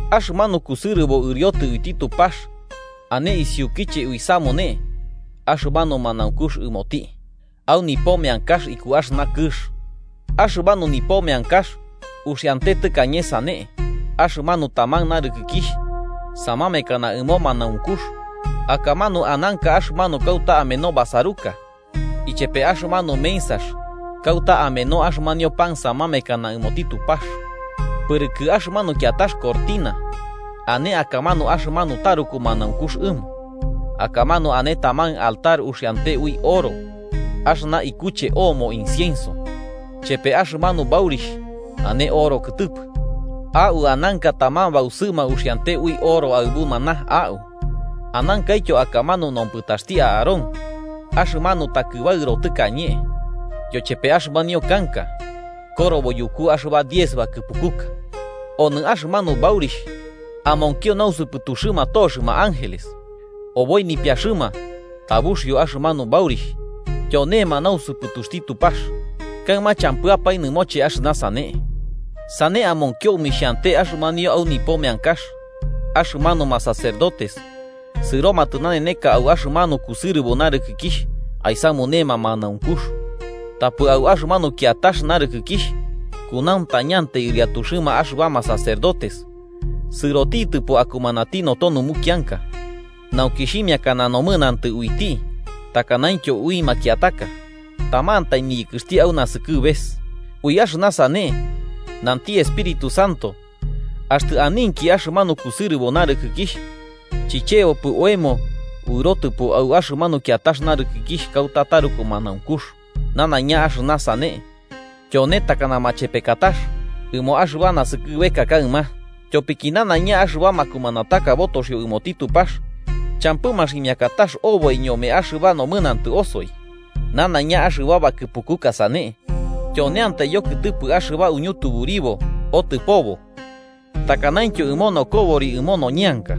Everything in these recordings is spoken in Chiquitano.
Axɨmanu kusɨrɨbo ɨriotɨ uiti Tupax ane isiukiche uisamune axɨmanu manaunkux ɨmoti, au nipo meankax iku axɨna kɨx. Axɨmanu nipo meankax uxiante tɨkañe sane: axɨmanu taman narɨkɨkixh samamekana ɨmo manaunkux, akamanu ananka axɨmanu kauta ameno basaruka ichepe axɨmanu mensax kauta ameno axɨmanio pan samamekana ɨmoti Tupax. Pɨrɨkɨ axɨmanu kiatax cortina ane akamanu axɨmanu taruku manaunkux ɨmo. Akamanu ane taman altar uxiante ui oro axɨna ikuche oomo incienso, chepe axɨmanu baurixh ane oro kɨtɨpɨ. Au ananka taman bausɨma uxiante ui oro aɨbu maná au anankaityo akamanu nompɨtaxti Aarón, axɨmanu takɨbaɨro tɨkañe, yochepe axɨmanio kanka korobo yuku axɨba diez bakɨpukuka. Onɨ axɨmanu baurixh amonkio nausɨpɨtuxɨma toxɨma ángeles, oboi nipiaxɨma tabuxio axɨmanu baurixh tyonema nausɨpɨtuxti Tupax. Kaɨma champɨapae nɨmoche axɨna sane. Sane amonkio omixhiante axɨmanio au nipo meankax, axɨmanuma sacerdotes sɨromatɨ naneneka au axɨmanu kusɨrɨbo narɨkɨkixh aisamunema manaunkux. Tapɨ au axɨmanu kiatax narɨkɨkixh kunauntañatiatai ɨriatuxɨma axɨbama sacerdotes sɨrotitɨpo akumanati noto numukianka nauki xhimiakana nomɨnantɨ uiti takanaintyo ui makiataka tamantai niyɨkɨxti au nasɨkɨbes. Ui axɨna sane, nanti Espíritu Santo, axtɨ aninki axɨmanu kusɨrɨbo narɨkɨkixh, chichebopɨ oemo uɨrotɨpo au axɨmanu kiatax narɨkɨkixh kauta taruku manaunkux. Nanaiña axɨna sane tyone takana machepekatax ɨmo axɨba naskɨbeka kaɨma. Tyopiki nanaiña axɨba makumanataka botoxio ɨmoti Tupax champɨ maximiakatax oboi ñome axɨba nomɨnantɨ osoi. Nanaiña axɨba bakɨpukuka sane tyoneiantai yokɨtɨpɨ axɨba uñutuburibo otɨpobo, takanaintyo ɨmo nokobori ɨmo noñeanka,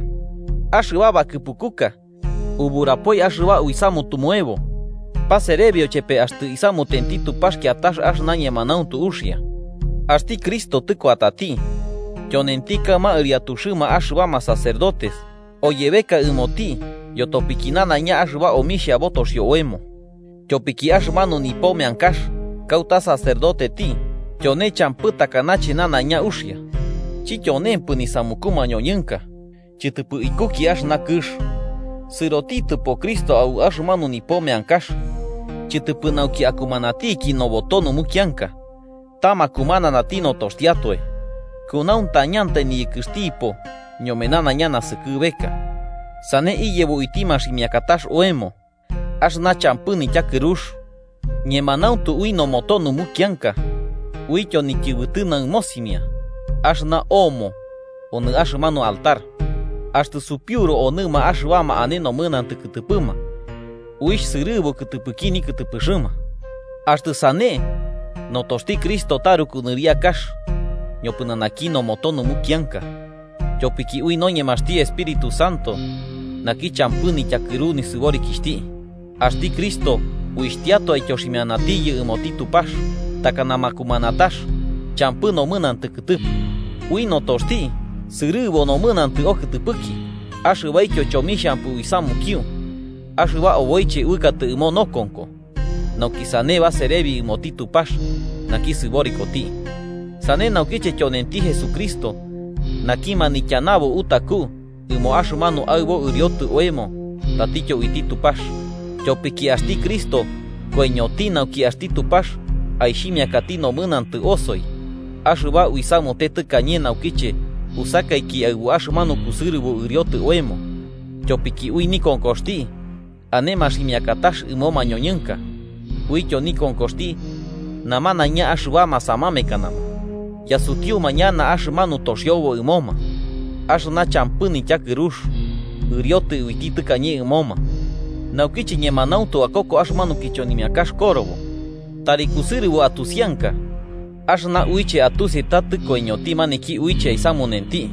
axɨba bakɨpukuka uburapoi axɨba uisamutumuebo, paserebio chepe axtɨ isamutenti Tupax kiatax axɨna ñemanauntu uxia. Axti Cristo tɨkuatati, tyonenti kaɨma ɨriatuxɨma axɨbama sacerdotes oyebeka ɨmoti yotopiki nanaiña axɨba omixha botoxio oemo. Tyopiki axɨmanu nipo meankax kauta sacerdoteti tyone champɨ takanache nanaiña uxia. Chityonempɨ nisamuku mañoñɨnka, chɨtɨpɨ ikuki axɨna kɨx. Sɨrotitɨpo Cristo au axɨmanu nipo meankax, chɨtɨpɨ nauki akumanatiki noboto numukianka, ta makumananti notoxtiatoe. Kunauntañantai niyɨkɨxtipo ñome nanaiña naskɨbeka, sane iyebo uiti maximiakatax oemo axɨna champɨ nityakɨrux. Ñemanauntu ui noboto numukianka, uityo nityɨbɨtɨ naɨmosimia axɨna oomo onɨ axɨmanu altar, axtɨ supiuru onɨma axɨbama ane nomɨnantɨ kɨtɨpɨma, uixh sɨrɨbu kɨtɨpɨki nikɨtɨpɨxɨma. Axtɨ sane, ¡notoxti Cristo taruku nɨriakax ñopɨnanaki noboto numukianka! Tyopiki ui noñemaxti Espíritu Santo, naki champɨ nityakɨru nisɨborikixhti, axti Cristo uixhtiatoe aityoximianatiyɨ ɨmoti Tupax takana makumanatax champɨ nomɨnantɨ kɨtɨpɨ, ui notoxti sɨrɨbu nomɨnantɨ okɨtɨpɨki axɨbaityo chomixhampɨ uisamukio axɨba oboiche uɨkatɨ ɨmo nokonko, nauki sane baserebi ɨmoti Tupax naki sɨborikoti. Sane naukiche tyonenti Jesucristo naki manityanabo utaku ɨmo axɨmanu aɨbo ɨriotɨ oemo tatityo uiti Tupax. Tyopiki axti Cristo koiñoti nauki axti Tupax aixhimiakati nomɨnantɨ osoi axɨba uisamute tɨkañe naukiche usakaiki aɨbu axɨmanu kusɨrɨbo ɨriotɨ oemo, tyopiki ui nikonkoxti ane maximiakatax ɨmo mañoñɨnka, uityo nikonkoxti, namanaiña axɨbama samamekanama yasutiuma ñana axɨmanu toxiobo ɨmoma axɨna champɨ nityakɨrux ɨriotɨtɨ uiti tɨkañe ɨmoma. Nauki ñemanauntu akoko axɨmanu kichonimiakax korobo, tari kusɨrɨbo atusianka axɨna uiche atusi ta tɨkoiñoti maniki uiche aisamunenti.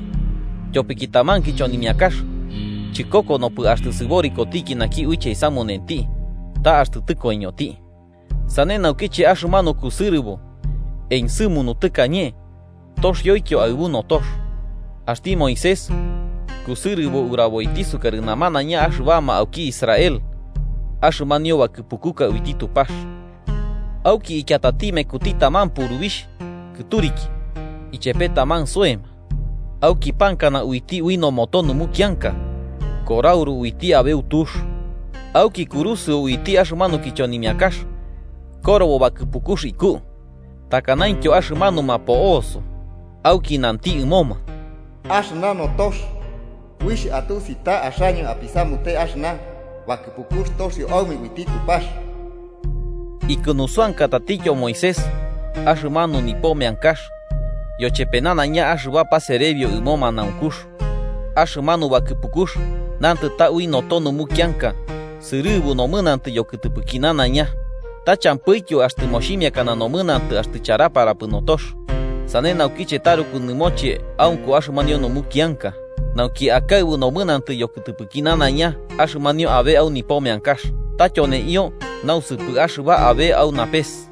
Tyopiki taman kichonimiakax chɨkokonopɨ axtɨ sɨborikotiki naki uiche aisamunenti, ta axtɨ tɨkoiñoti. Sane naukiche axɨmanu kusɨrɨbo ensɨmunu tɨkañe toxioityo aɨbu notox. Axti Moisés kusɨrɨbo uraboiti sukarɨ namanaiña axɨbama auki Israel axɨmanio bakɨpukuka uiti Tupax. Auki ikiatati mekuti taman purubixh kɨturiki ichepe taman soema, auki pankana uiti ui noboto numukianka korauru uiti aɨbu tux, auki kurusɨo uiti axɨmanu kichonimiakax korobo bakɨpukux iku takanaintyo axɨmanuma po'oso. Auki nanti ɨmoma: “Axɨna notox uixh atusi ta axaño apisamute axɨna bakɨpukux toxio aume uiti Tupax.” Ikunusɨankatatityo Moisés axɨmanu nipo meankax yochepe nanaiña axɨba paserebio ɨmo manaunkux. Axɨmanu bakɨpukux nantɨ ta ui noto numukianka sɨrɨbu nomɨnantɨ yokɨtɨpɨki nanaiña. Ta champɨityo axtɨ moximiakana nomɨnantɨ axtɨ charaparapɨ notox. Sane naukiche taruku nɨmoche aunko axɨmanio numukianka, nauki akaɨbu nomɨnantɨ yokɨtɨpɨki nanaiña axɨmanio abe au nipo meankax, ta tyoneio nausɨpɨ axɨba abe au napes,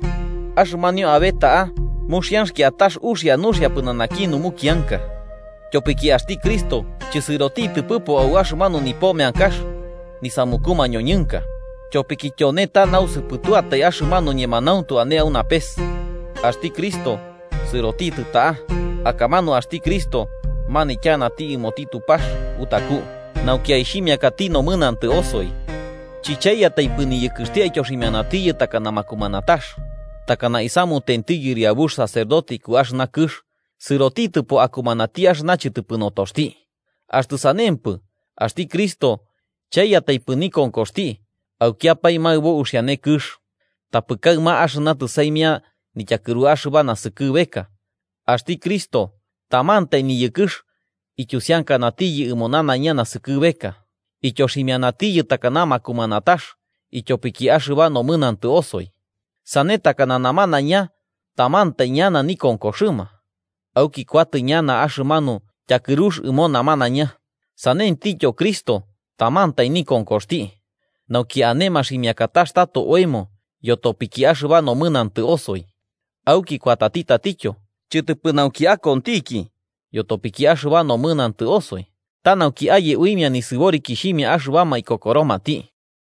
axɨmanio abe ta'a muxianx kiatax uxia nuxia pɨnanaki numukianka. Tyopiki axti Cristo chɨsɨrotitɨpɨpo au axɨmanu nipo meankax nisamuku mañoñɨnka, tyopiki tyone ta nausɨpɨtuatai axɨmanu ñemanauntu ane au napes. Axti Cristo sɨrotitɨ ta'a, akamanu axti Cristo manityanati ɨmoti Tupax utaku nauki aixhimiakati nomɨnantɨ osoi. Chɨchaiyataipɨ niyɨkɨxti aityoximianatiyɨ takana makumanatax, takana isamutenti Yɨriabux sacerdote iku axɨna kɨx, sɨrotitɨpo akumanati axɨna chɨtɨpɨ notoxti. Axtɨ sanempɨ, axti Cristo chaiyataipɨ nikonkoxti aukiapae maɨbo uxiane kɨx. Tapɨ kaɨma axɨna tɨsaimia nityakɨru axɨba naskɨbeka, axti Cristo tamantai niyɨkɨx ityusiankanatiyɨ ɨmo nanaiña naskɨbeka, ityoximianatiyɨ takana makumanatax ityopiki axɨba nomɨnantɨ osoi. Sane takana namanaiña tamantai ñana nikonkoxɨma, auki kuatɨ ñana axɨmanu tyakɨrux ɨmoma namanaiña, sanentityo Cristo tamantai nikonkoxti, nauki ane maximiakatax tato oemo yotopiki axɨba nomɨnantɨ osoi. Auki kuatati tatityo, chɨtɨpɨ nauki akontiki yotopiki axɨba nomɨnantɨ osoi, ta nauki aye uimia nisɨborikixhimia axɨbama ikokoromati.